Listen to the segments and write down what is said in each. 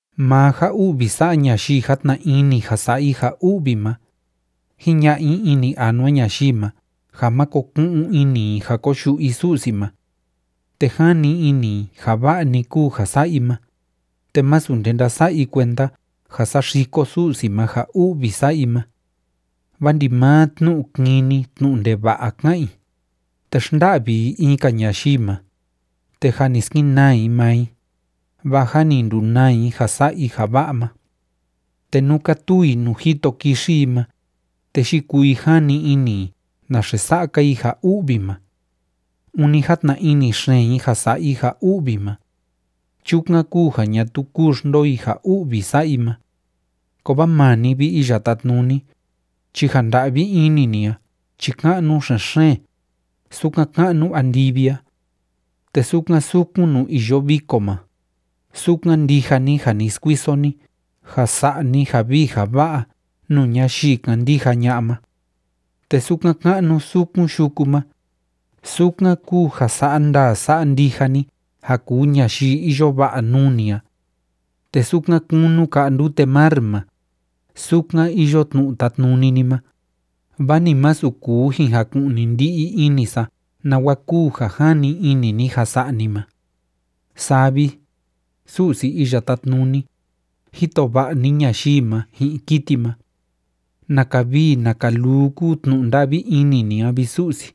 Maa ja u'vi sa'a ñayii játna ini ja sa'a i ja u'vi ma, jiña'a i ini anua ñayii ma ja máko ku'un ini i ja koyu'u i Su'si ma. Te jani ini i ja va'a‑ni kúu ja sa'a i ma, te másu nde ndása'a i kuenda ja saxiko Su'si ma ja u'vi sa'a i ma. Vaa ndimaa tnu'u kini tnu'u ndeva'a ká'an i, te xnda'vi i in‑ka ñayii ma, te jâ ni skenaa i maa i, vaa jâ ni ndunaa i ja sa'a i ja va'a ma. Te nú kátuu i nuu jito kixi i ma, te yikuu i jani ini i naxe sa'a‑ka i ja u'vi ma. Ûni játna ini xeen i ja sa'a i ja u'vi ma. Chukan kúu ja ñatuu kúu xndoo i ja u'vi sa'a i ma. Kovaa maa ni, vi Iya Tátnuni, chi ja nda'vi ini ni a chi ka'nu xen‑xeen, sukan ka'nu andivi a. Te sukan sukun nuu iyo viko ma, sukan ndija ni ja ni skuiso ni ja sa'a ni ja vii ja va'a nuu ñayii kándija ña'a ma. Te sukan ka'nu sukun yuku ma, sukan kúu ja sa'a ndaa sa'a ndija ni ja kuu ñayii iyo va'a nuu ni a. Te sukan kunu ka'a ndute mar ma, sukan iyo tnu'u tátnuni ni ma, vaa ni masu kuu jin jaku'ni ndi'i ini sa nawa kúu ja jani ini ni ja sa'a ni ma. Saa vi, Su'si Iya Tátnuni, jito va'a ni ñayii ma ji'in kiti ma. ¡Naka vii naka luu kúu tnu'u nda'vi ini ni a, vi Su'si!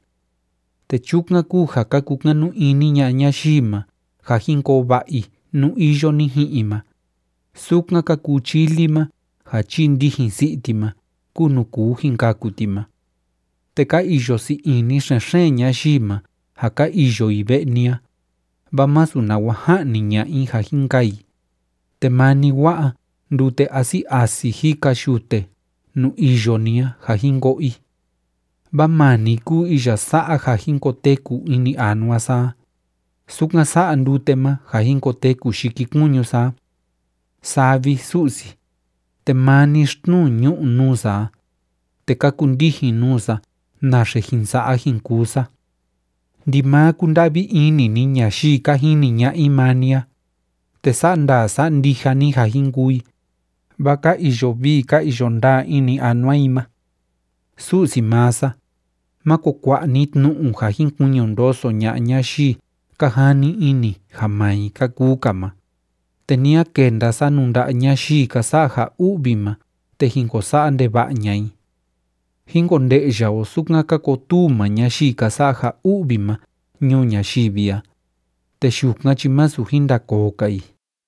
Te chukan kúu ja ka kukanu ini ña'a ñayii ma ja jin koo va'a i nú iyo ni ji'in i ma, sukan ka kuu chili ma ja chii ndijin si'i ti ma kúu nuu kuu jin kaku ti ma. Te ka iyo sii ini xen‑xeen ñayii ma ja ka iyo i ve'e ni a, vaa masu nawa ja'ni ña'a i ja jin kaa i, te maa ni wa'a ndute asi asi jika yute nuu iyo ni a ja jin ko'o i. Vaa maa ni kúu iya sa'a ja jin koteku ini anua sa a, sukan sa'a ndute ma ja jin koteku yikikuñu sa a. Saa vi, Su'si, te maa ni xtnuu ñu'u nuu sa a, te ka kundijin nuu sa naxe jin sa'a jin kuu sa. Ndimaa kúnda'vi ini ni ñayii ka jini ña'a i maa ni a, te sa'a ndaa sa'a ndija ni ja jin kuu i, vaa ka iyo vii ka iyo ndaa ini anua i ma. Su'si maa sa, máko kua'a ni tnu'u ja jin kuiñu ndoso ña'a ñayii ka jani ini ja maa i ka kuu‑ka ma, te ni a kenda sa nuu nda'a ñayii ka sa'a ja u'vi ma te jin ko sa'a ndeva'a ña'a i. Jín konde'ya o sukan ka kotuu maa ñayii ka sa'a ja u'vi ma ñuu ñayivi a, te yukan chi másu jin ndakoo‑ka i.